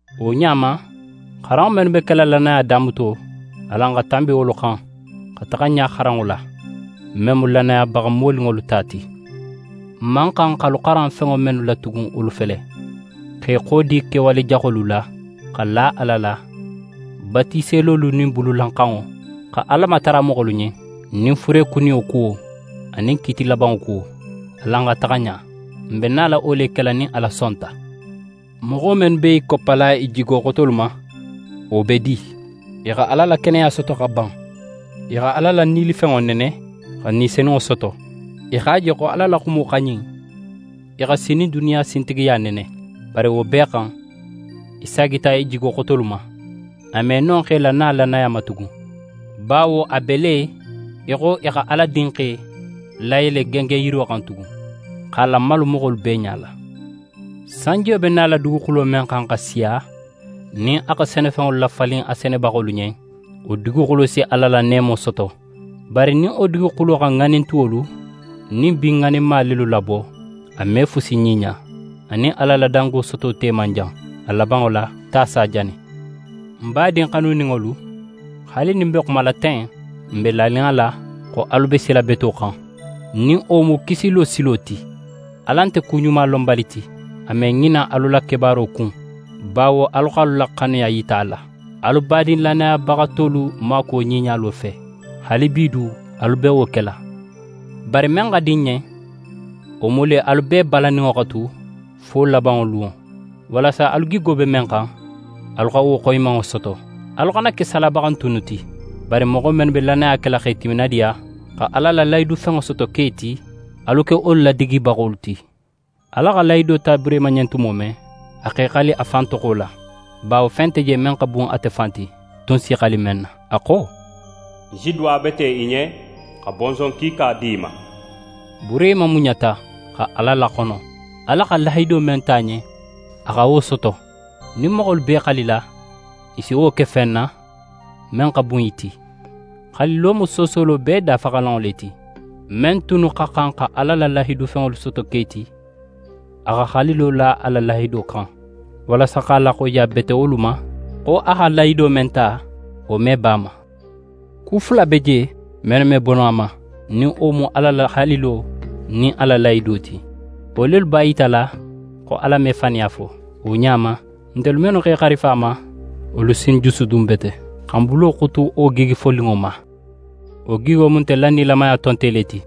Wo ɲa ma, xaranŋo mennu be kela lannaya damuto, alan xa tanbi wolu xan, xa taxa ɲa xaranŋo la, men mu lannayabaxa moninŋolu ta ti. N man xan xa alu xaran fenŋo mennu la tugun wolu fele: X'é xodi kewale jaxolu la, xa la Ala la, batiselolu nin bululanxanŋo, xa Ala matara moxolu ɲen, nin furekuniyo kuwo, anin kiiti labanŋo kuwo. Alan xa taxa ɲa! N be nala wo le kela nin Ala sonta. Moxo mennu be i koppala i jigo xotolu ma, wo be di? I xa Ala la keneya soto xa ban. I xa Ala la nilifenŋo nene, xa Ni Senunŋo soto. I x'a je xo Ala la xumo xa ɲin, i xa sinin duniya sintigiya nene. Bari wo bee xan, i saagita i jigo xotolu ma. A me no x'e lana lannaya ma tugun, bawo a be le í xo i xa Ala Dinxe layele gengenyiro xan tugun, x'a lamalu moxolu bee ɲala. Sanjiyo be nala duguxulo men xan xa siya, nin a xa senefenŋolu lafalin a senebaxolu ɲen, wo duguxulo si Ala la neemo soto. Bari nin wo duguxulo xa ŋanin tuwolu nin bin ŋaninma lelu labo, a me fusi ɲiɲa, a nin Ala la dango soto te man jan. A labanŋo la, ta si a jani. Ń badin xanuninŋolu, haali nin n be xumala ten, n be lanin a la xo alu be sila beto xan, nin wo mu kisilo silo ti. Ala nte kuɲumalonbali ti, a me ŋina alu la kebaaro kun, bawo alu x'alu la xanuya yita a la, alu badin lannayabaxa tolu maakuwo ɲiɲalo fe. Haalibi du, alu be wo kela. Bari men xa di n ɲen, wo mu le alu bee balanninŋo xa tu fo labanŋo lunŋo, walasa alu gigo be men xan, alu xa wo xoyimanŋo soto. Alu xana ke salabaxantunnu ti, bari moxo mennu be lannaya kela x'e timinadiya, xa Ala la lahidufenŋo soto ke ti, alu ke wolu ladigibaxolu ti. Ala xa lahido ta Burehima ɲen tumo men, a x'é xali a fan toxo la, bawo fen nte je men xa bun ate fan ti, a tun si í xali men na. A xo: «Ń si duwabete í ɲen, xa bonson kiika di í ma.» Burehima muɲata, xa Ala laxono. Ala xa men lahido ta a ɲen, a xa wo soto. Nin moxolu b'e xalila, i si wo ke fen na, men xa bun i ti. Xalilo mu soosolo bee dafaxalanŋo le ti. Men tunnu xa xan xa Ala la lahidufenŋolu soto ke ti, a xa xalilo la a la lahido xan, walasa x'a laxoyiyabete wolu ma, xo a xa lahido men ta, wo me bo a ma. Ku fula be je, mennu me bo no a ma, nin wo mu Ala la xalilo nin a la lahido ti. Wo lelu b'a yitala xo Ala me faniya fo. Wo ɲa ma, ntelu mennu x'e xarifa a ma, wolu si n jusudun bete, xa n bulo xutu wo gigi foninŋo ma. Wo gigo mu ntelu la nilamaya tonte le ti,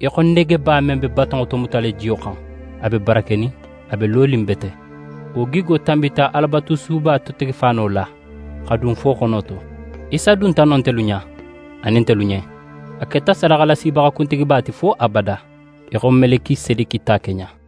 í xo negeba men be batonŋo tomutala jiyo xan. A be barakenin, a be lonin bete. Wo gigo tanbita Alabatusuba totegefaano la, xa dun fo xono to. Isa dunta non ntelu ɲa, anin ntelu ɲen. Ate keta sadaxalasibaxa kuntigiba ti fo abada, í xo Melikisedeki ta keɲa.